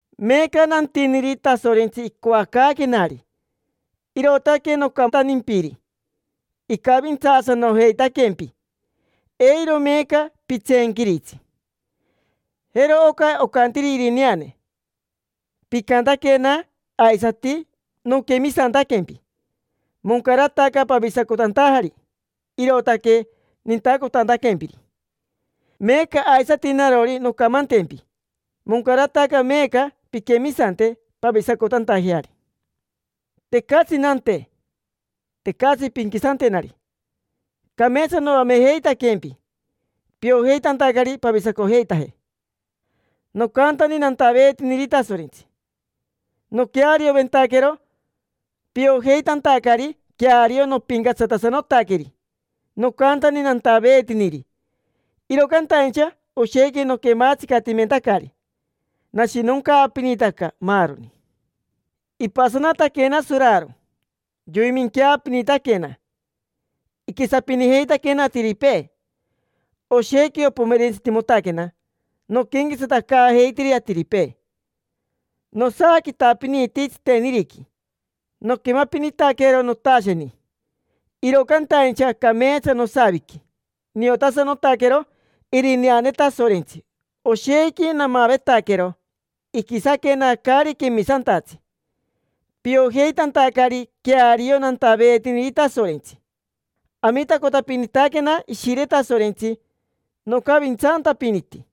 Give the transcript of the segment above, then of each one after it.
Meeca nantiniri Tasorentsi icoacaaquenari, irootaque nocantantimpiri: icavintsaasanojeitaquempi. Eiro meeca pitseenquiritsi. Jero oca ocantiri irineane: “Picantaquena, aisati noquemisantaquempi; moncarataca pavisacotantajari, irootaque nintacotantaquempiri”. Meeca aisati narori noncamantempi: moncarataca meeca pinquemisante, pavisacotantajeari. Tecatsi nante, tecatsi pinquisantenari; cameetsa noamejeitaquempi piojeitantacari pavisacojeitaje. Nocantani nantaveetiniri Tasorentsi, noquearioventaquero, piojeitantacari queario nopincatsatasanotaqueri. Nocantani nantaveetiniri, iro cantaincha oshequi noquematsicatimentacari, nashinoncaapinitaca, maaroni. Ipasanataquena soraro, yoiminqueapinitaquena. Iquisapinijeitaquena atiripee. Oshequi opomerentsitimotaquena noquenquetsatacaajeitiri atiripee. Nosaaquitapiniti tsiteniriqui. Noquemapinitaquero notasheni. Iro cantaincha cameetsa nosaviqui, niotasanotaquero irineane Tasorentsi, oshequi namavetaquero iquisaquena caari quemisantatsi, piojeitantacari queario nantaveetiniri Tasorentsi. Amitacotapinitaquena Ishire Tasorentsi, nocavintsantapiniti,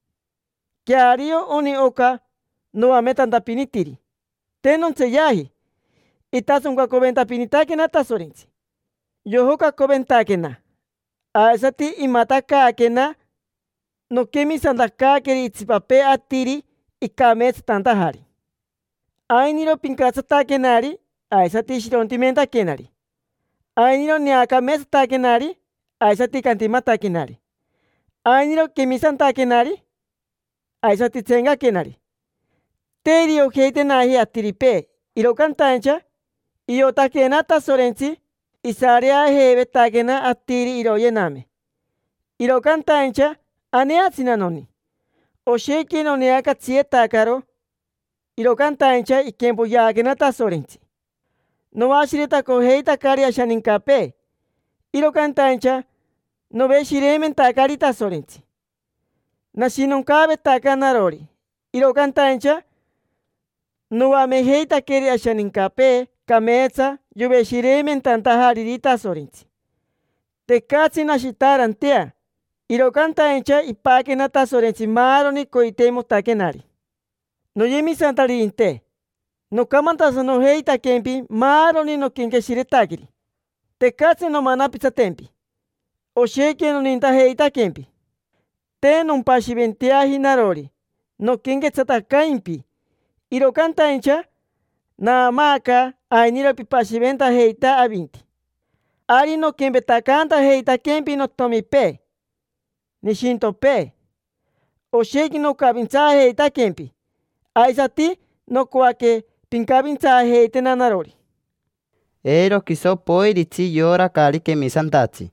queario oni oca noametantapinitiri, te nontseeyaji. Itasoncacoventapinitaquena Tasorentsi, yojocacoventaquena, aisati imatacaaquena noquemisantacaaqueri itsipapee atiri icameetsatantajari. Ainiro pincatsataquenari aisati shirontimentaquenari. Ainiro neacameetsataquenari aisati cantimataquenari. Ainiro quemisantaquenari aisati tseencaquenari. Te iriojeitenaji atiripee, iro cantaincha iotaquena Tasorentsi. Isareajeivetaquena atiri iroyename, iro cantaincha aneatsina noni. Oshequi noneacatsiyetacaro, iro cantaincha iquempoyeaquena Tasorentsi. Noashiretacojeitacari ashanincapee, iro cantaincha noveshireimentacari Tasorentsi. Nashinoncaavetaca narori, iro cantaincha noamejeitaqueri ashanincapee cameetsa yoveshireimentantajariri Tasorentsi. Tecatsi nashitaarantea, iro cantaincha ipaquena Tasorentsi maaroni coiteimotaquenari. Noyemisantaririnte, nocamantasanojeitaquempi maaroni noquenqueshiretaqueri, tecatsi nomanapitsatempi. Oshequi nonintajeitaquempi. Te nompashiventeaji narori noquenquetsatacaimpi, iro cantaincha naamaaca ainiro pipashiventajeita avinti. Ari noquempetacaantajeitaquempi notomipee, nishintopee: oshequi nocavintsaajeitaquempi. Aisati nocoaque pincavintsaajeitena narori. Eiro quiso poiritsi yora caari quemisantatsi.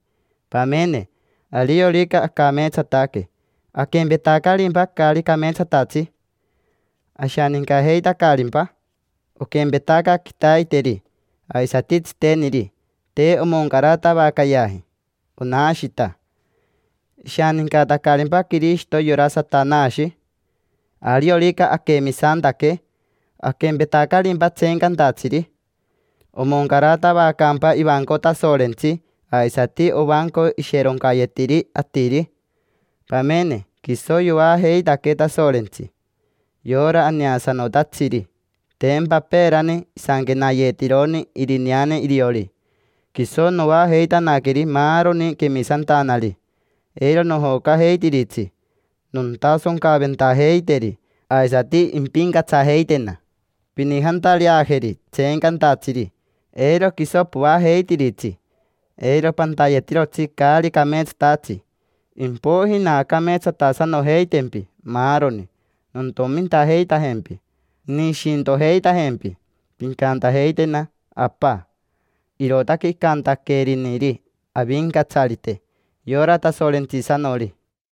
Pamene, ariorica acameetsataque, ¿aquempetacarimpa caari cameetsatatsi? ¿Ashanincajeitacarimpa? Oquempetaca quitaiteri aisati tsiteniri: te omoncaratavacayeaji, onashita. ¿Ishanincatacarimpa Quirishito yora Satanashi? Ariorica aquemisantaque, ¿aquempetacarimpa tseencantatsiri? ¿Omoncaratavacaacampa ivanco Tasorentsi aisati ovanco isheroncayetiri atiri? Pamene, quiso yoajeitaquee Tasorentsi, yora aneasanotatsiri, tempa peerani isanquenayeetironi irineane iriori: “Quiso noajeitanaqueri maaroni quemisantanari, eiro nojocajeitiritsi. Nontasoncaventajeiteri, aisati impincatsajeitena. Pinijantareajeri tseencantatsiri, eiro quiso poajeitiritsi, eiro pantayetirotsi caari cameetsatatsi. Impoiji naacameetsatasanojeitempi maaroni, nontomintajeitajempi, nishintojeitajempi, pincantajeitena: ‘Apa’. Irootaque icantaqueriniri Avincatsarite, yora Tasorentsisanori”.